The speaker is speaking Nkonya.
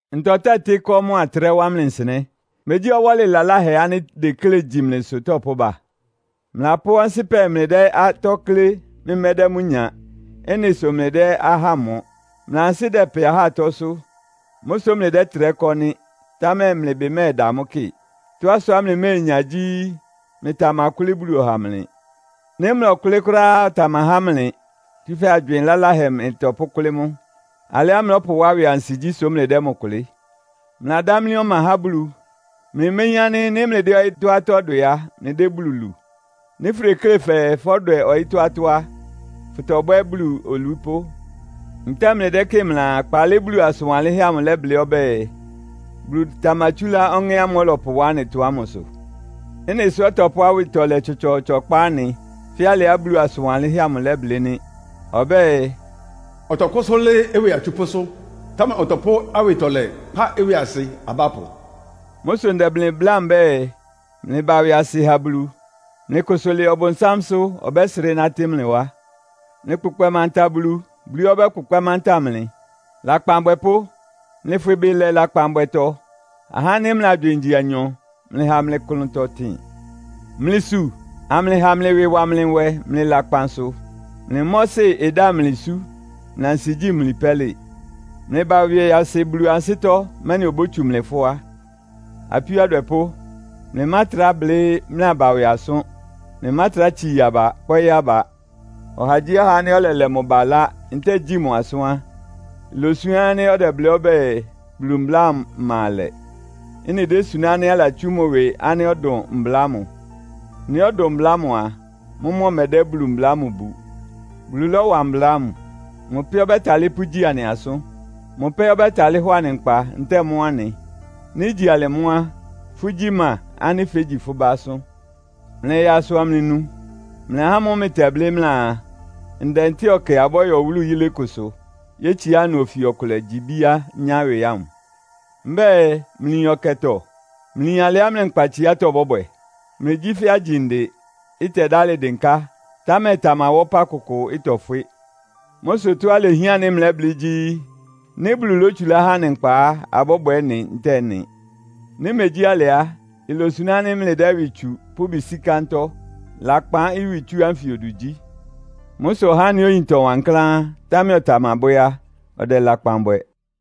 Ntɔ tɛ́tɩ́ ɩkɔ́ mʋ́a ɩtrɛ́ wá mlɩ nsɩnɛ́? Megyí ɔwɔ́lɩ laláhɛ ánɩ́ ideklé igyi mlɩsʋ tɔpʋ́ba? Mlɩlapʋ́ ɔnsɩ́pɛ mlɩdɛ́ atɔ́ klé, mlɩmɛ́dɛ́ mʋ́ nya. Ɩ́nɩ sʋ mlɩdɛ́ ahá mɔ. Mlɩ ansɩ́ dɛpɛ ahá atɔ́sʋ́. Mʋ́ sʋ́ mlɩdɛ́trɛ́ kɔ́ nɩ́, támɛ mlɩ ɩbɩ mɛ́ɛda mʋ́ kɩ. Tɔ́á sʋá mlɩményá gyí, mlɩtamakʋ́lɩ́ Bulu ɔha mlɩ. Nɩ́ mlɔkʋ́lɩ́ kʋ́ráá á, ɔtamahá mlɩ, tsúfɛ́ agywɩɩn laláhɛ mlɩtɔpʋ́kʋ́lɩ́ mʋ. Alɩá mlɔ́pʋwá ɩwɩ ansigyí sʋ mlɩdɛ́ mʋ kʋlɩ́. Mlɩladámlí ɔma há Bulu. Mlɩméyín ánɩ́ nɩ́ mlɩdɛ́ ɔyɩ́tɔ́ atɔ́ dwɛ á, mlɩdɛ́ Bulu lu? Nɩ́ fʋdeklé fɛɛ fɔ́dwɛ ɔyɩ́tɔ́ atɔ́ á, fʋtɔbwɛ́ Bulu olupʋ́. Ntɛ́ɛ mlɩdɛ́kɩ́ɩ mlɩaa, kpaalɩ Bulu asʋn wanlɩ́nhɛ́ amʋ ɩlɛblɩ́ ɔbɛ́ɛ, “Bulu tamatsúlá Ɔŋɛ́ ámʋ́ʋ́ ɔlɔpʋwá anɩtɔ ámʋsʋ?” Ɩ́nɩ sʋ́ ɔtɔpʋ́ awɩtɔlɛ tsɔtsɔɔtsɔ kpá anɩ, fɛ́ alɩá Bulu asʋn wanlɩ́nhɛ́ amʋ ɩlɛblɩ́ nɩ́. Ɔbɛ́ɛ, “Ɔtɔkʋ́sʋ́ lɩ́ɩ́ ɩwɩ atsupʋ́sʋ́, támɛ ɔtɔpʋ́ awɩtɔlɛ kpá ɩwɩasɩ abápʋ.” Mʋ́ sʋ ndɛ mlɩ bláa mbɛ́ɛ, mlɩbá ɩwɩasɩ ha Bulu. Mlɩkʋsʋ lɩɩ Ɔbʋnsámsʋ́, ɔbɛ́srɩ́ nátɩ́ mlɩ wá. Mlɩkpʋkpɛ manta Bulu, Bulu ɛ́ ɔbɛ́kpʋkpɛ́ manta mlɩ. Lakpan abwɛpʋ́, mlɩfwɩ ɩbɩ lɛ lakpanbwɛtɔ. Ahá ánɩ́ mlɩ agywɩɩn igyi anyɔ, mlɩha mlɩ klʋntɔ ɩtɩn. Mlɩsu, amlɩha mlɩ ɩwɩ ɩwa mlɩ nwɛ, mlɩ lakpan sʋ. Mlɩ mɔ́sɩ ɩdámli isú, mlɩ ansigyí imli pɛ́lɩ. Mlɩba ɩwɩasɩ Bulu ansɩ́tɔ́, mɛ́nɩ obótsu mlɩ fʋ́á. Apíó adwɛpʋ́, mlɩmátrá blɩ́ mlɩ aba ɩwɩ asʋ́n. Mlɩmátrá tsii aba, kpɔ́ɩ́ aba. Ɔhagyíɔha ánɩ́ ɔlɛlɛ mʋ ba ɩlá ntɛ́ɛ gyi mʋ asʋ́n á, ilosuná ánɩ́ ɔdɛblɩ́ ɔbɛ́ɛ, Bulu mbla ámʋ ɩma alɛ. Ɩ́nɩ désuná ánɩ́ alatsú mʋ ɩwɩ ánɩ́ ɔdʋn mbla ámʋ. Nɩ́ ɔdʋn mbla ámʋ a, mʋ́mʋ́ ɔmɛdɛ́ Bulu mbla ámʋ bu. Bulu lɔ́wa mbla ámʋ. Mʋ pɛ́ ɔbɛ́talɩ́ pʋ́ mʋ́ gyi anɩ asʋ́n. Mʋ pɛ́ ɔbɛ́talɩ́ hɔ anɩ nkpa, ntɛ́ɛ mɔ́ anɩ. Nɩ́ igyi alɩ mʋ́ á, fʋ́gyí ma ánɩ́ fégyi fʋ́ bá asʋ́n? Mlɩya asʋ amlɩnu. Mlɩ ahá ámʋ́ʋ́ mlɩtɛblɩ́ mlɩaa, “Ndɛ ntɛ́ɛ ɔkɛ abɔ́yɔ wúlu yilé kʋsʋ, yétsiá ɩnʋ ofi ɔkʋlɛ gyi ibíá nyá ɩwɩ” ámʋ. Mbɛ́ɛ, mlɩyin ɔkɛtɔ? Mlɩyin alɩá mlɩ nkpatsiátɔ́ bɔ́bwɛ? Mlɩgyí fɛ́ agyinde, ɩtɛdálɩ dɩnká, támɛ ɩtamawá ɔpá kʋkʋ, ɩtɔfwɩ́. Mʋ́ sʋ tɔ́á ilehián ánɩ́ mlɛ́blɩ́ gyí, “Nɩ́ Bulu lótsulá há anɩ nkpa á, abɔ́bwɛ ɩ́nɩ ntɛ́ɛ ɩ́nɩ.” Nɩ́ imegyí alɩ á, ilosuná ánɩ́ mlɩdɛ́ ɩwɩ tsu, pʋ́ ɩbɩ sí kántɔ́. Lakpan ɩwɩtsú ánfɩ odu gyí. Mʋ́ sʋ ɔhá ánɩ́ oyin ɩtɔ wankláán, támɛ ɔtamabwɛ́ á, ɔdɛ lakpan bwɛ.